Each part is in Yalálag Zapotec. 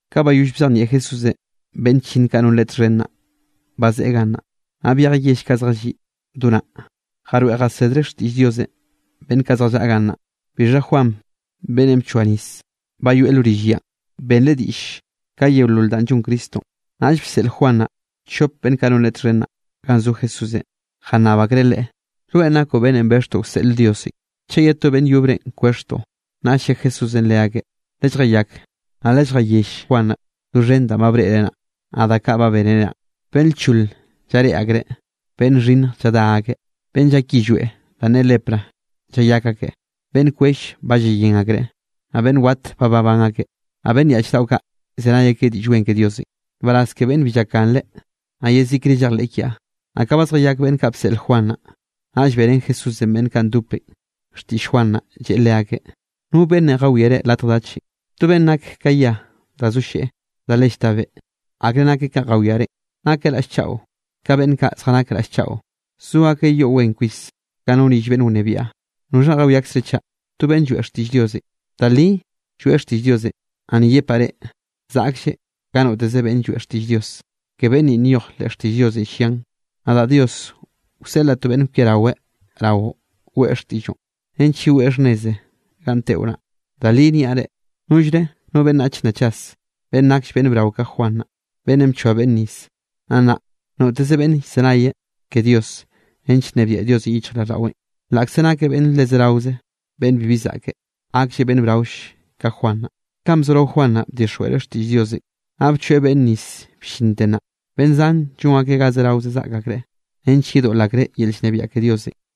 Ka bayoll bzejnieꞌ Jesúsenꞌ beꞌnn chllinn kaꞌ non Leꞌe txhen naꞌ, bazeꞌe gannaꞌ, naꞌ byejeꞌ yell kaꞌ zjalliꞌ do naꞌ, jaroeꞌ jasedreꞌ xtiꞌll Diosenꞌ beꞌnn kaꞌ zjallaꞌa gannaꞌ. Bixha Juan beꞌnnenꞌ bchoa nis, ba yoeꞌ lo rill yanꞌ. Benreꞌ diꞌll, ka yeolol danꞌ llon Cristonꞌ. Naꞌll bseꞌl Juan naꞌ chop beꞌnn kaꞌ non leꞌe txhen naꞌ, ganꞌ zo Jesúsenꞌ, Jannab akreꞌ Leꞌe: —¿Rweꞌn nakoꞌ beꞌnnenꞌ bexhtoꞌ wseꞌl Diosenꞌ, chaꞌ ye to beꞌnn yobrenꞌ kwexhtoꞌ? Naꞌll lle Jesúsenꞌ leakeꞌ: —Lelljayak, naꞌ lelljayell Juan naꞌ doxhen danꞌ ba breꞌre naꞌ, naꞌ da kaꞌ ba bénere naꞌ. Beꞌnn lchol llareꞌe akreꞌ, beꞌnn xhinnj lladá akeꞌ, beꞌnn llak yillweꞌ danꞌ ne lepra llayak akeꞌ, beꞌnn kwell ba llayén akreꞌ, naꞌ beꞌnn wat ba babán akeꞌ, naꞌ beꞌnn yaꞌch daꞌo kaꞌ llzenay akeꞌ Diꞌll Wen ke Diosenꞌ. ¡Nbaraz ke beꞌnnenꞌ bi llakganreꞌ, naꞌ yezikre llejleꞌ kiaꞌ! Naꞌ ka ba zjayak beꞌnn kaꞌ bseꞌl Juan naꞌ, naꞌll beꞌrén Jesúsenꞌ beꞌnn kaꞌ ndopenꞌ xtiꞌll Juan naꞌ, lleꞌe leakeꞌ: —¿No beꞌnnenꞌ jawiare latj dachenꞌ? ¿To beꞌnn nak ka yia da zo lleꞌ da le llta beꞌ? ¿Akre nakeꞌ kanꞌ jawiare? ¿Nakeꞌ raꞌll chaꞌo? Ka beꞌnn kaꞌ zjanak raꞌll chaꞌo, zo akeꞌ yoꞌ wen kwis, ka no rill beꞌnn wnebiaꞌ. ¿Noxhanꞌ jawiakzre chaꞌ? ¿To beꞌnn lloeꞌ xtiꞌll Diosenꞌ? Da li lloeꞌ xtiꞌll Diosenꞌ, naꞌ ni yepaꞌ reꞌ, zaꞌklleꞌ ka noteze beꞌnn lloeꞌ xtiꞌll Dios. Ke beꞌnn ni nyoj leꞌ xtiꞌll Diosenꞌ, llian: Nadaꞌ Dios, wseꞌlaꞌ to beꞌnn kwiaraweꞌ raoꞌ, weꞌe xtiꞌlloꞌn nench yeweꞌ xhnneze ganꞌ teꞌo naꞌ. Da li niaꞌ reꞌ, nollre no beꞌnnach nna chas, beꞌnn nakll beꞌnn brao ka Juan naꞌ, beꞌnnenꞌ bchoa beꞌnne nis. Naꞌ nnaꞌ noteze beꞌnn llzenay ke Dios, nench nnebiaꞌ Diosenꞌ yichjraꞌlldaꞌweꞌn, laꞌkze nakeꞌ beꞌnne le zeraoze beꞌnne bibi zaꞌke, gaklleꞌ beꞌnn braoll ka Juan naꞌ. ’Kanꞌ bzorao Juan naꞌ bdixjweꞌreꞌ xtiꞌll Diosenꞌ, naꞌ bchoeꞌ beꞌnne nis bllinte nnaꞌ, beꞌnn zan llon akeꞌn ga zerao zaꞌk akreꞌ, nench yedoꞌl akreꞌ yel llnebiaꞌ ke Diosenꞌ.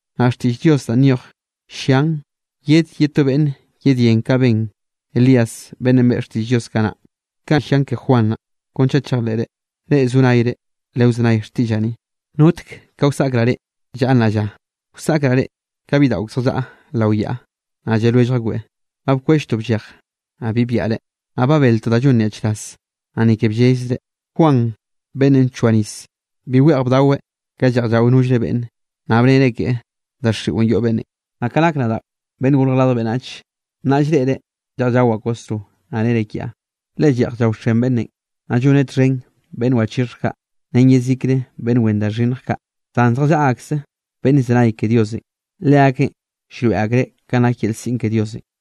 Naꞌ xtiꞌll Diosenꞌ danꞌ nyoj llian yed ye to beꞌnn yedyén kanꞌ ben Elías, beꞌnnenꞌ beꞌe xtiꞌll Diosenꞌ kanaꞌ. Kaꞌ llian ke Juan naꞌ, kon chaꞌ chejleꞌre. Reꞌ zo nayre, lewzenay xtiꞌllaꞌ ni. ’¿Notek ka wsaꞌkraꞌ reꞌ llaꞌa nnaꞌ lla? Wsaꞌkraꞌ reꞌ ka bidaꞌo ak zjallaꞌa lao yaꞌa, naꞌ lle lwellj akbeꞌ: “Ba bkwelltoꞌ bllej, naꞌ bi byaꞌre, naꞌ ba beltoꞌ da llon nyaꞌchraz, naꞌ ni ke bllellzre.” Juan beꞌnnenꞌ bchoa nis, bi weꞌj bdaochaꞌweꞌ ka lleꞌj llao nollre beꞌnne, naꞌ bnere keꞌe: “Daxiꞌo yoꞌ beꞌnnenꞌ.” Naꞌ ka nak nadaꞌ Beꞌnnenꞌ Gorj Radj Beꞌnnach, naꞌ llreꞌre lleꞌj llawaꞌ kwasro, naꞌ nere kiaꞌ: “Le lleꞌj llaoxen beꞌnnenꞌ, naꞌ lloneꞌ txhen beꞌnn wachixhj kaꞌ, ren yezikre beꞌnn wen da xhinnj kaꞌ.” Zan zjallaꞌa akse beꞌnn llzenay ke Diosenꞌ. Leakeꞌn llroeꞌ akreꞌ kanꞌ nak yel siꞌn ke Diosenꞌ.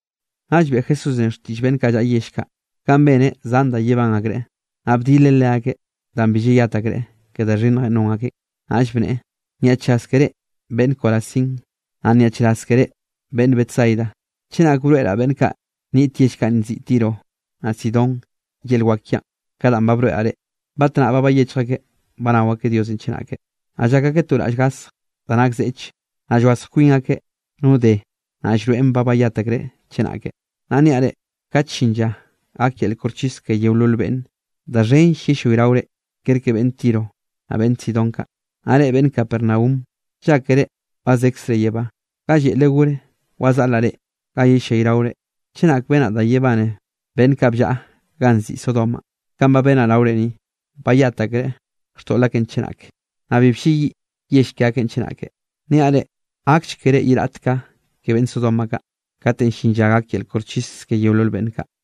Naꞌll beꞌe Jesúsenꞌ xtiꞌll beꞌnn kaꞌ llaꞌa yell kaꞌ, ganꞌ beneꞌ zan da yebán akreꞌn, naꞌ bdileꞌ leakeꞌ danꞌ bi llayat akreꞌ ke da xhinnjenꞌ non akeꞌn, naꞌll bneꞌe: —¡Nyaꞌchraz ke reꞌ beꞌnn Corazín! ¡Naꞌ nyaꞌchraz ke reꞌ beꞌnn Betsaida! Chenake broeꞌraꞌ beꞌnn kaꞌ niꞌt yell kaꞌ nziꞌi Tiro, naꞌ Sidón yel wak kiaꞌn ka danꞌ ba broeꞌraꞌ reꞌ, batnaꞌ ba bayechj akeꞌ banao akeꞌ Diosenꞌ chenake, naꞌ llak akeꞌ to raꞌll gasj da nak zeꞌch, naꞌ llwazj kwin akeꞌ no de da llroeꞌn ba bayat akreꞌ chenake. Naꞌ niaꞌ reꞌ, kate llin lla gak yel koxchis ke yeolol beꞌnne, da xhenll yellayraore kerke beꞌnn Tiro, naꞌ beꞌnn Sidón kaꞌ. Naꞌ reꞌ beꞌnn Capernaum, llákere ba zekzre yebá, ga lleꞌle gor wazaꞌleꞌ reꞌ, ga yellayraore. Chenak benaꞌ da yebane beꞌnn kaꞌ bllaꞌa ganꞌ nziꞌi Sodomanꞌ kanꞌ ba benaꞌ raore ni, bayat akreꞌ xtoꞌl akeꞌn chenake, naꞌ bi blleyiꞌ yell ke akeꞌn chenake. Niaꞌ reꞌ, gakll keré ye raꞌt ka ke beꞌnn Sodoma kaꞌ, katenꞌ llin lla gak yel koxchis ke yeolol beꞌnn kaꞌ.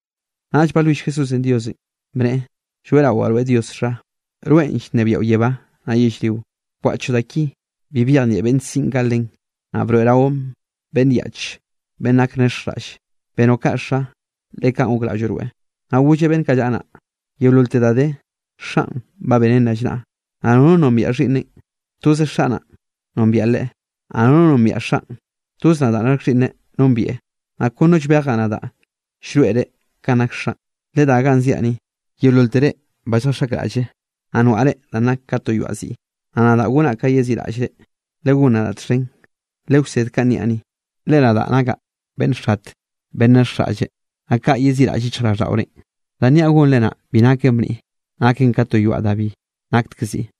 Naꞌll balwill Jesúsenꞌ Diosenꞌ, bneꞌe: —Lloeꞌrawaꞌ rweꞌ Dios Xa, rweꞌn llnebiaꞌo yebá naꞌ yellrionꞌ, bkwaꞌchoꞌ da ki, bi byejnieꞌ beꞌnn siꞌn kaꞌ len, naꞌ broeꞌroꞌn beꞌnn yaꞌch beꞌnn nak nexjraꞌlle. Benoꞌ kaꞌ Xa, le kaꞌn gokraꞌlloꞌ rweꞌ. Naꞌ golleꞌ beꞌnn kaꞌ llaꞌa naꞌ: —Yeololte da de, Xaꞌn ba beneꞌn rallnaꞌ, naꞌ nono nombiaꞌ Xhiꞌnneꞌn, toz Xaꞌ naꞌn nombieꞌ Leꞌe, naꞌ nono nombiaꞌ Xaꞌn, toz nadaꞌ nak Xhiꞌnneꞌ nombieꞌ, naꞌ kon no llbejaꞌ nadaꞌ llroeꞌreꞌ kanꞌ nak Xaꞌn. Ledá ganꞌ ziaꞌ ni, yeololtere ba lljaxaꞌkraꞌlle, naꞌ noaꞌre danꞌ nak ka to yoaꞌ ziꞌ. Naꞌ nadaꞌ gonnaꞌ ka yeziꞌraꞌllre. Legón nadaꞌ txhen, lewsed kanꞌ niaꞌ ni, le nadaꞌ nakaꞌ beꞌnn xate beꞌnn nexjraꞌlle, naꞌ kaꞌ yeziꞌraꞌll yichjraꞌlldaꞌorenꞌ. Danꞌ niaꞌ gonre naꞌ, bi naken bniꞌ, naken ka to yoaꞌ da bi naktek ziꞌ.